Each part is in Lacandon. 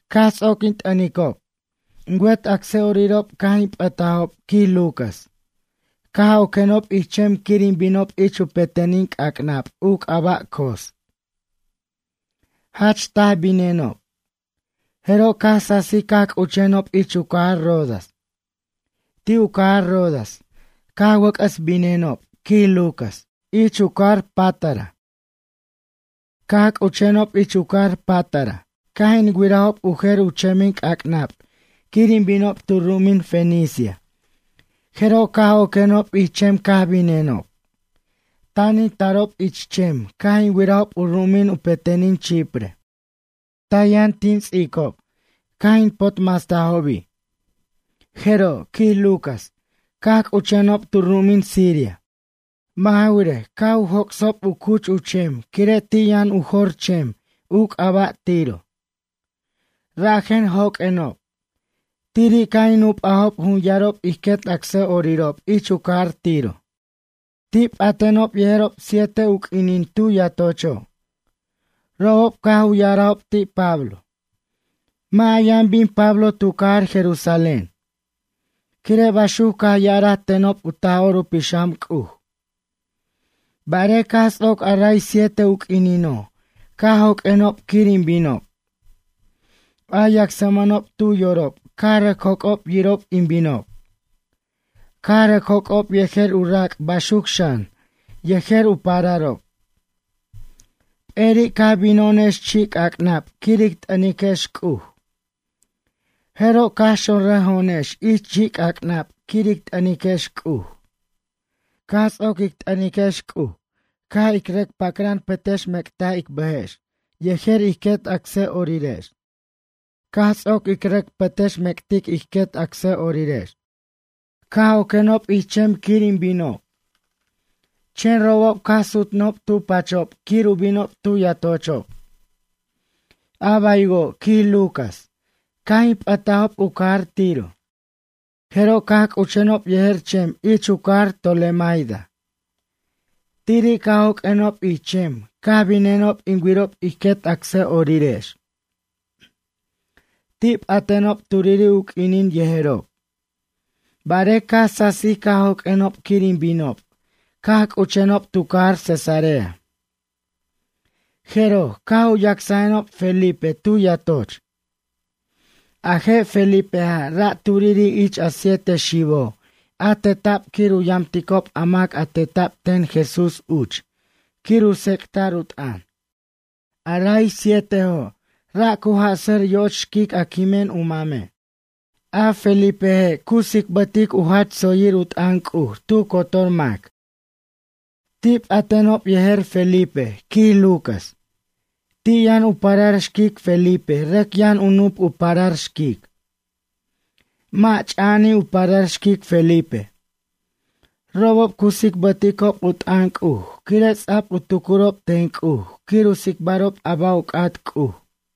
Caj ts'oc in t'ʌnic'ob. In wet acsa'orirob caj in p'ʌtajob, quij Lucas, caj oquenob ich chem quir in binob ich u petenin c'ac'nab u c'aba' Cos. Jach taj binenob. Jeroj caj sasij caj c'uchenob ich u cajar Rodas. Ti' u cajar Rodas caj wʌc'ʌs binenob, quij Lucas, ich u cajar Pátara. Caj c'uchenob ich u cajar Pátara caj in wirajob u jer u chemin c'ac'nab quir in binob tu ru'umin Fenicia, Jeroj caj oquenob ich chem caj binenob. Tan in tarob ich chem, caj in wirajob u ru'umin u petenin Chipre. Taj yʌn tin ts'icob, caj in potmastajobi'. Jeroj, quij Lucas, caj c'uchenob tu ru'umin Siria. Mʌ' ja wirej, caj u joc'sob u cuch u chem quire' ti' yʌn u jor chem, u c'aba' Tiro. Rajen joq'uenob. Tiri' caj in nup'ajob jun yarob ij quet acsa'orirob ich u cajar Tiro. Ti' p'atenob yejerob siete u q'uinin tu yatocho'. Robob caj u ya'arajob ti' Pablo: ―Mʌ' a yʌn bin Pablo tu cajar Jerusalén. Quire' baxuc caj ya'araj tenob u Taj'or u Pixam C'uj. Barej caj ts'oc a ray siete u q'uinino', caj joq'uenob quir in binob. A yacsmʌnob tu yorob caj rʌc joc'ob yirob in binob. Caj rʌc joc'ob yejer u rac' baxuc xan, yejer u pararob. Peri' caj bino'onex chi' c'ac'nab quir ic t'ʌniquex C'uj. Jeroj caj xonrʌjo'onex ich chi'c'ac'nab quir ic t'ʌniquex C'uj. Caj ts'oc ic t'ʌniquex C'uj caj ic rʌc pacran pʌtʌxmec'taj ic bʌjex yejer ij quet acsa'orirex. Caj ts'oc ic rʌc pʌtʌxmec'tic ij quet acsa'orirex, caj oquenob ich chem quir in binob. Chen robob caj sutnʌjob tu pachob quir u binob tu yatochob. A baywo', quij Lucas, caj in p'ʌtajob u cajar Tiro, jeroj caj c'uchenob yejer chem ich u cajar Tolemaida. Tiri' caj joq'uenob ich chem caj binenob in wirob ij quet acsa'orirex. Ti' p'atenob turiri' u q'uinin yejerob. Barej caj sasij caj joq'uenob quir in binob, caj c'uchenob tu cajar Cesarea. Jeroj, caj u yacsajenob Felipe tu yatoch. A je' Felipeja', ra' turiri' ich a siete xibo', a teta'b quir u yamticob a mac a teta'b ten Jesús uch quir u tsec'ta'r u t'ʌn. A ray sietejo', ra' cu jʌ'sʌr yo'och xquic a quimen u mame'. A Felipeje', cu tsicbʌtic u jach tsoyir u t'ʌn C'uj tu cotor mac. Ti' p'atenob yejer Felipe, quij Lucas. Ti' yʌn u parar xquic Felipe, rʌc yʌn u nup u parar xquic. Mʌ' ch'a'ani' u parar xquic Felipe. Robob cu tsicbʌticob u t'ʌn C'uj quire' ts'a'b u tucurob ten C'uj quir u tsicbarob a ba' u c'at C'uj.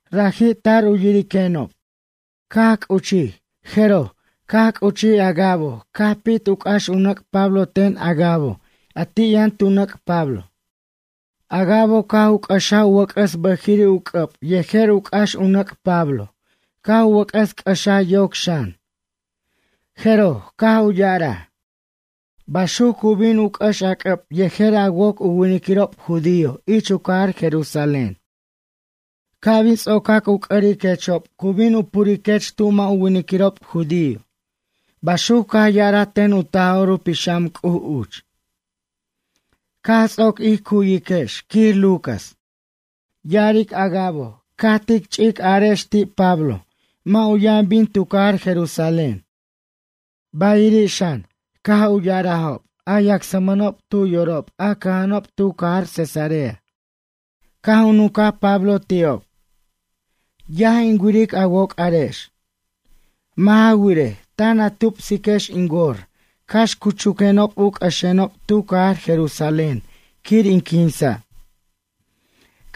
Raji' tar u yiriquenob. Caj c'uchij, jeroj, caj c'uchij Agabo, caj pit u c'ax u nʌc' Pablo ten Agabo a ti' yʌn u nʌc' Pablo. Agabo caj u c'axaj u wʌc'ʌs bʌjiri' u c'ʌb yejer u c'ax u nʌc' Pablo, caj u wʌc'ʌs c'ʌxaj yoc xan. Jeroj, caj u ya'araj: ―Baxuc cu bin u c'ʌx a c'ʌb yejer a woc u winiquirob judío ich u cajar Jerusalén. Ca' bin ts'ocac u c'ʌriquechob cu bin u puriquech tu mʌ' u winiquirob judío ―baxuc caj ya'araj ten u Taj'or u Pixam C'uj uch. Caj ts'oc ij cu'yiquex, quij Lucas, ya'aric Agabo caj tic chich arajex ti' Pablo mʌ' u yʌn bin tu cajar Jerusalén. Bayiri' xan, caj u ya'arajob a yacsmʌnob tu yorob a cʌja'anob tu cajar Cesarea. Caj u nuncaj Pablo ti'ob: ―Yaj in wiric a woc'arex. Mʌ' ja wirej, tan a tupsiquex in wor cax cu chuquenob u c'ʌxenob tu cajar Jerusalén quir in quinsa'.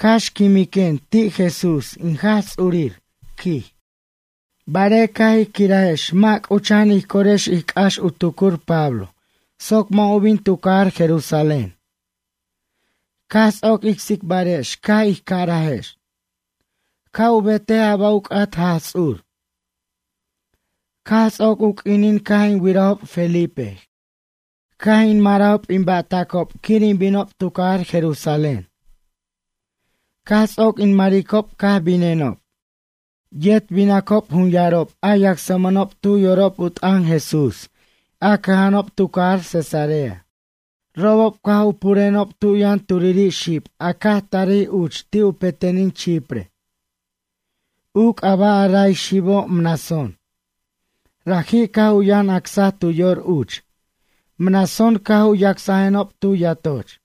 Cax quimiquen ti' Jesús, in Jaj Ts'urir ―quij. Barej caj ij quirajex mʌ' c'ucha'an ij corex ij c'ax u tucur Pablo, soc mʌ' u bin tu cajar Jerusalén. Caj ts'oc ic tsibarex caj ij carajex: ―Ca' u betej a ba' u c'at Jaj Ts'ur. Caj ts'oc u q'uinin caj in wirajob Felipe, caj in marajob in ba'tacob quir in binob tu cajar Jerusalén. Caj ts'oc in maricob caj binenob. Yet binacob jun yarob a yacsmʌnob tu yorob u t'ʌn Jesús a cʌja'anob tu cajar Cesarea. Robob caj u purenob tu yʌn turiri' xib a caj tarij uch ti' u petenin Chipre. U c'aba' a ray xibo', Mnasón. Raji' caj u yʌn acsaj tu yor uch. Mnasón caj u yacsajenob tu yatoch.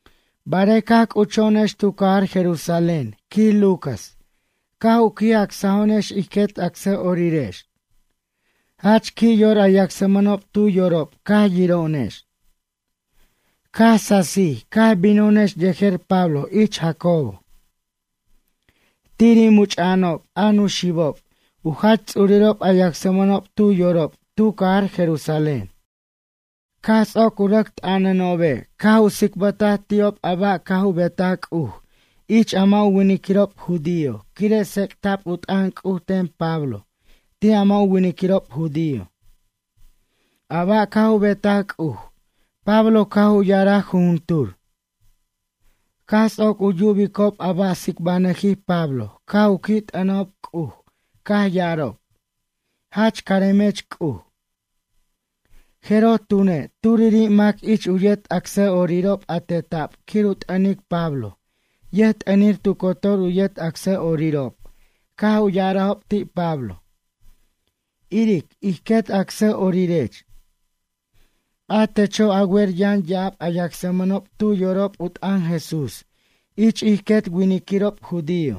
Barej caj c'ucho'onex tu cajar Jerusalén, quij Lucas, caj u qui' acsajo'onex ij quet acsa'orirex. Jach qui' yor a yacsmʌnob tu yorob caj yiro'onex. Caj sasij caj bino'onex yejer Pablo ich Jacobo. Tiri' much'a'anob a nuxibob u jach ts'urirob a yacsmʌnob tu yorob tu cajar Jerusalén. Caj ts'oc u rʌc t'ʌnanobe' caj u tsicbʌtaj ti'ob a ba' caj u betaj C'uj ich a mʌ' u winiquirob judío quire' tsec'ta'b u t'ʌn C'uj ten Pablo ti' a mʌ' u winiquirob judío. A ba' caj u betaj C'uj Pablo caj u ya'araj jujuntur. Caj ts'oc u yubicob a ba' tsicbanʌjij Pablo caj u qui' t'ʌnajob C'uj caj ya'arob: ―Jach caremech C'uj. Jeroj tune', turiri' mac ich u yet acsa'orirob a teta'b quir u t'ʌnic Pablo yʌjt'ʌnir tu cotor u yet acsa'orirob, caj u ya'arajob ti' Pablo: ―Iric, ij quet acsa'orirech. A techo', a wer yʌn ya'ab a yacsmʌnob tu yorob u t'ʌn Jesús ich ij quet winiquirob judío.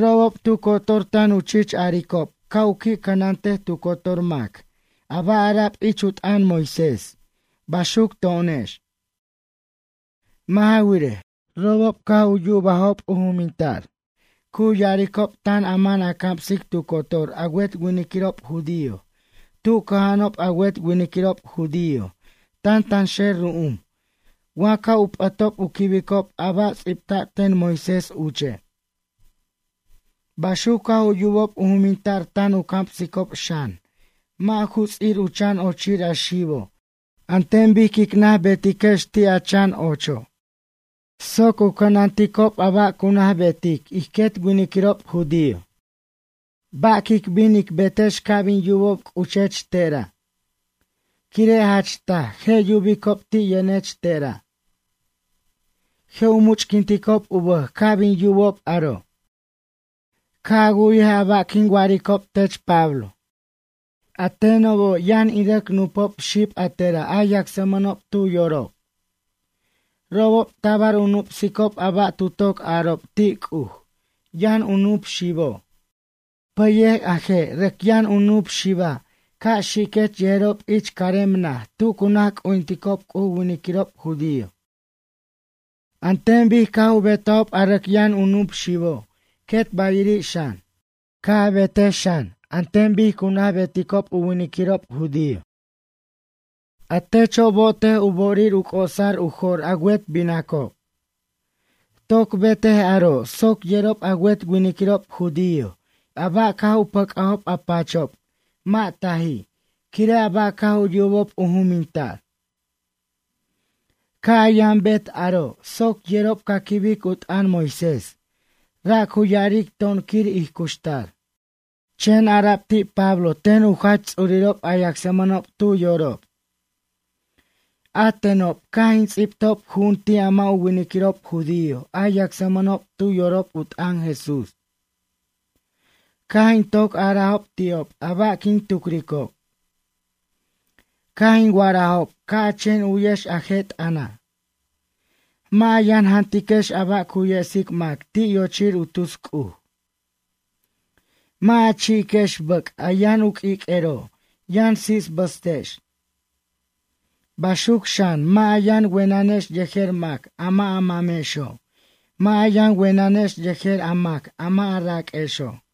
Robob tu cotor tan u chich aricob ca' u qui' cʌnantej tu cotor mac a ba' ara'b ich u t'ʌn Moisés, baxuc to'onex. Mʌ' ja wirej, robob caj u yubajob u juminta'r cu ya'aricob tan a man a camsic tu cotor a wet winiquirob judío tu cʌja'anob a wet winiquirob judío tantanxer ru'um, wa ca' u p'ʌtob u quibicob a ba' ts'ibta'b ten Moisés uche'. Baxuc caj u yubob u juminta'r tan a camsicob xan mʌ' ju ts'ir u chan ochir a xibo', an ten bic quic naj betiquex ti' a chan ocho', soc u cʌnanticob a ba' cu naj betic ij quet winiquirob judío. Ba' quic bin ic betex ca' bin yubob c'uchech tera'? Quire' jach taj, je' yubicob ti' yʌnech te'ra'. Je' u much'quinticob u bʌj ca' bin yubob aro'. Ca' a wu'yej a ba' quin wa'aricob tech Pablo. A tenobo', yʌn in rʌc nupo' xib a tera', a yacsmʌnob tu yorob. Robob tabar u nup'sicob a ba' tu toc arob ti' C'uj yʌn u nup xibo'. Pʌyej a je' rʌc yʌn u nup xiba', ca' xiquech yejerob ich carem naj tu cu naj c'ujinticob C'uj u winiquirob judío. An ten bic caj u betajob a rʌc yʌn u nup xibo' quet bayiri' xan, ca' a betic xan an ten bic cu naj beticob u winiquirob judío. A techo', bo'otej u bo'orir u c'osar u jo'r a wet binacob. Toc betej aro' soc yerob a wet winiquirob judío a ba' caj u pʌc'ajob a pachob mʌ' taji' quire' a ba' caj u yubob u juminta'r. Ca' a yʌn a bet aro' soc yerob ca quibic u t'ʌn Moisés ra' cu ya'aric to'on quir ij cuxtar. Chen ara'b ti' Pablo ten u jach ts'urirob a yacsmʌnob tu yorob: ―A tenob, caj in ts'ibtob ju'un ti' a mʌ' u winiquirob judío, a yacsmʌnob tu yorob u t'ʌn Jesús. Caj in toc arajob ti'ob a ba' quin tucricob. Caj in wa'arajob ca' a chen u'yex a je' t'ʌna': “Mʌ' a yʌn jantiquex a ba' cu yesic mac ti' yochir u tus c'uj. Mʌ' a chi'iquex bʌc', a yʌn u q'uiq'uero', yʌn sisbʌstex. Baxuc xan, mʌ' a yʌn wenʌnex yejer mac a mʌ' a mamexo' mʌ' a yʌn wenʌnex yejer a mac a mʌ' a raq'uexo'.”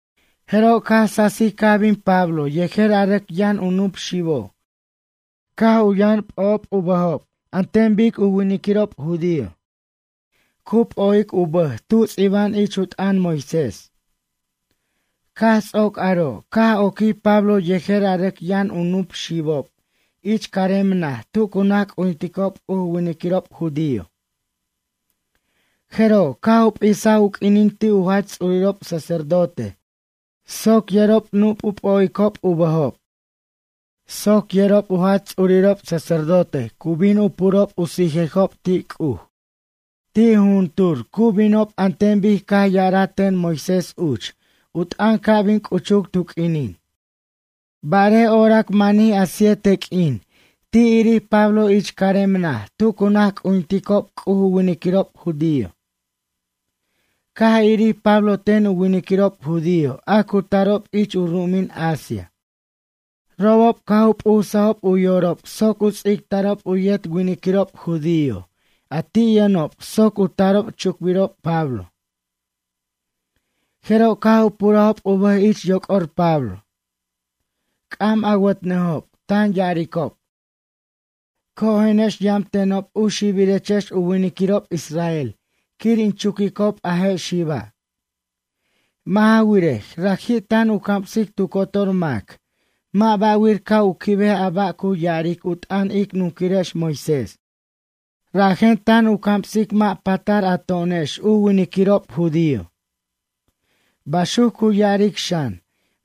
Jeroj, caj sasij caj bin Pablo yejer a rʌc yʌn u nup xibo' caj u yʌn p'ojob u bʌjob an ten bic u winiquirob judío nazarite cu p'o'ic u bʌj tu ts'iba'an ich u t'ʌn Moisés. Caj ts'oc aro', caj oquij Pablo yejer a rʌc yʌn u nup xibob ich carem naj tu naj c'ujinticob C'uj u winiquirob judío. Jeroj, caj u p'isaj u q'uinin ti' u jach ts'urirob sacerdote soc yerob nup' u p'o'icob u bʌjob. Soc yerob u jach ts'urirob sacerdote cu bin u purob u sijejob ti' C'uj, ti' jujuntur cu binob an ten bic caj ya'araj ten Moisés uch u t'ʌn ca' bin c'uchuc tu q'uinin. Barej orac manij a siete q'uin, ti' irij Pablo ich carem naj tu cu naj c'ujinticob C'uj u winiquirob judío. Caj irij Pablo ten u winiquirob judío a cu tarob ich u ru'umin Asia. Robob caj u p'usajob u yorob soc ts'ictarob u yet winiquirob judío, a ti' yʌnob soc u tarob chucbirob Pablo. Jeroj caj u purajob u bʌj ich yoc'or Pablo. C'am awʌtnʌjob, tan ya'aricob: ―Cojenex, yam tenob u xibirechex u winiquirob israel quir in chuquicob a je' xiba'. Mʌ' ja wirej. raji' tan u camsic tu cotor mac, mʌ' ba'wir ca' u quibej a ba' cu ya'aric u t'ʌn ic nunquirex Moisés. Rajen tan u camsic mʌ' patar a to'onex u winiquirob judío. Baxuc cu ya'aric xan,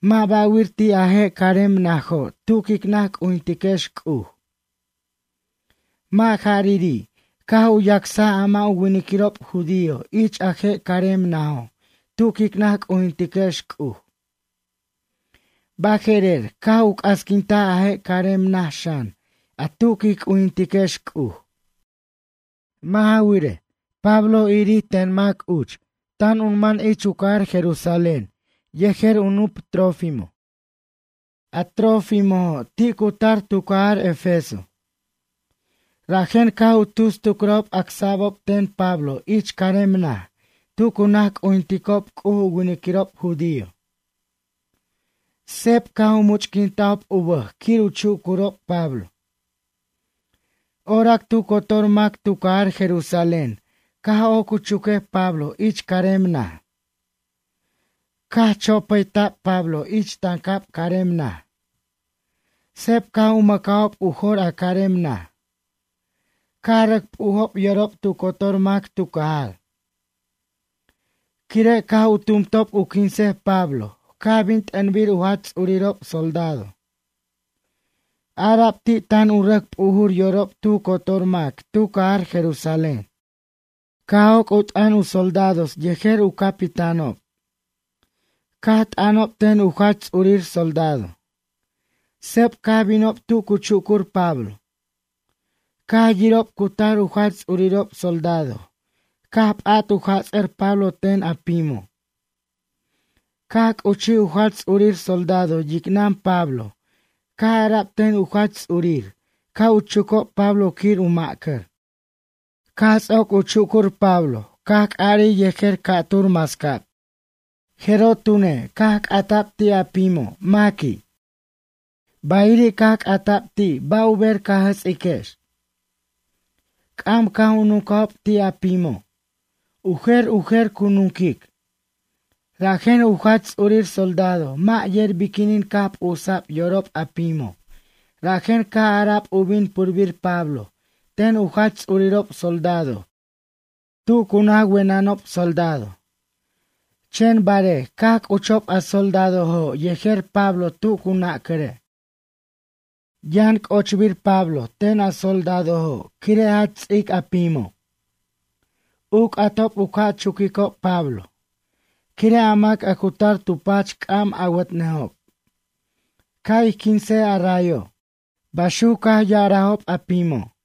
mʌ' ba'wir ti' a je' carem najo' tu quic naj c'ujintiquex C'uj. Mʌ' jariri', caj u yacsaj a mʌ' u winiquirob judío ich a je' carem najo', tu quic naj c'ujintiquex C'uj. Baje'rer, caj u c'asquintaj a je' carem naj xan a tu quij c'ujintiquex C'uj. Mʌ' ja wirej, Pablo irir ten mac uch tan u man ich u cajar Jerusalén yejer u nup Trófimo. A Trófimojo', ti' cu tar tu cajar Efeso. Rajen caj u tus tucrajob acsa'bo' ten Pablo ich carem naj tu cu naj c'ujinticob C'uj u winiquirob judío. Seb caj u much'quintajob u bʌj quir u chucurob Pablo. Orac tu cotor mac tu cajar Jerusalén caj oc u chuquej Pablo ich carem naj. Caj chopʌta'b Pablo ich tancab carem naj. Seb caj u mʌcajob u jor a carem naj. Caj rʌc p'ujob yorob tu cotor mac tu cajar. Quire' caj u tumtob u quinsej Pablo, caj bin t'ʌnbir u jach ts'urirob soldado. Ara'b ti' tan u rʌc p'ujur yorob tu cotor mac tu cajar Jerusalén. Caj joc' u t'ʌn u soldados yejer u capitánob. Caj t'ʌnob ten u jach ts'urir soldado. Seb caj binob tu cu chucur Pablo. Caj yirob cu tar u jach ts'urirob soldado caj p'at u jats'ʌr Pablo ten a pimo'. Caj c'uchij u jach ts'urir soldado yicnʌn Pablo caj ara'b ten u jach ts'urir ca' u chucob Pablo quir u ma'cʌr. Caj ts'oc u chucur Pablo caj c'arij yejer ca'tur mascab. Jeroj tune, caj c'ata'b ti' a pimo' maqui', bayiri' caj c'ata'b ti' ba' u ber ca jʌts'iquex. C'am caj u nuncajob ti' a pimo'. U jer u jer cu nunquic. Rajen u jach ts'urir soldado mʌ' yer biquinin caj p'usa'b yorob a pimo', rajen caj ara'b u bin purbir Pablo ten u jach ts'urirob soldado tu cu naj wenʌnob soldado. Chen barej, caj c'uchob a soldadojo' yejer Pablo tu cu nacʌre'. Yʌn c'ochbir Pablo ten a soldadojo' quire' jach ts'ic a pimo'. U c'atob u ca' chuquicob Pablo. Quire' a mac a cu tar tu pach c'am awʌtnʌjob: ―Ca' ij quinsej a rayo' ―baxuc caj ya'arajob a pimo'.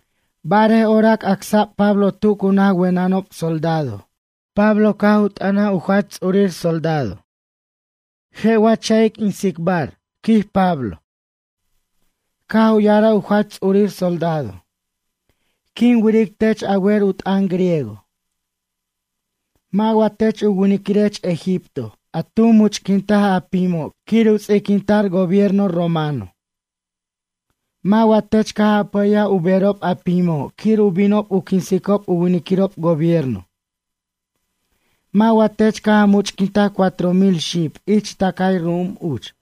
Barej orac acsa'b Pablo tu cu naj wenʌnob soldado caj u t'ʌnaj u jach ts'urir soldado Pablo: ―Cax tsicbanʌquenob? ―quij Pablo. Caj u ya'araj u jach ts'urir soldado: ―Quin wiric tech a wer u t'ʌn griego. Mʌ' wa tech u winiquirech egipto, a tu much'quintaj a pimo' quir u ts'iquinta'r gobierno romano? Mʌ' wa tech caj a pʌyaj u berob a pimo' quir u bin u quinsob u winiquirob gobierno. Mʌ' wa tech caj a much'quintaj cuatro mil xib ich tʌcay ru'um uch?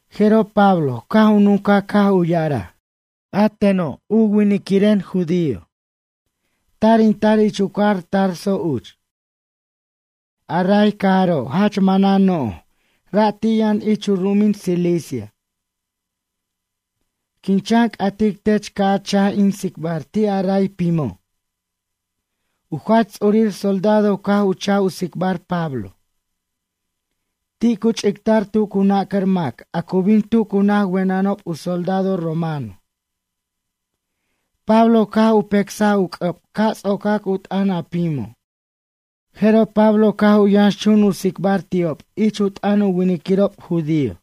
Jeroj Pablo, caj u nuncaj caj u ya'araj: ―A teno', u winiquireno' judío. Tar in tar ich u cajar Tarso uch. A ray cajaro' jach manan no'j, ra' ti' yʌn ich u ru'umin Cilicia. Quin chan c'atic tech ca' a cha'j in tsicbar ti' a ray pimo'. U jach ts'urir soldado caj u cha'j u tsicbar Pablo. Ti' cu ch'ictar tu cu nacʌr mac a cu bin tu cu naj wenʌnob u soldado romano. Pablo caj u pecsaj u c'ʌb ca' ts'ocac u t'ʌn a pimo'. Jeroj Pablo caj u yʌnxchun u tsicbar ti'ob ich u t'ʌn u winiquirob judío.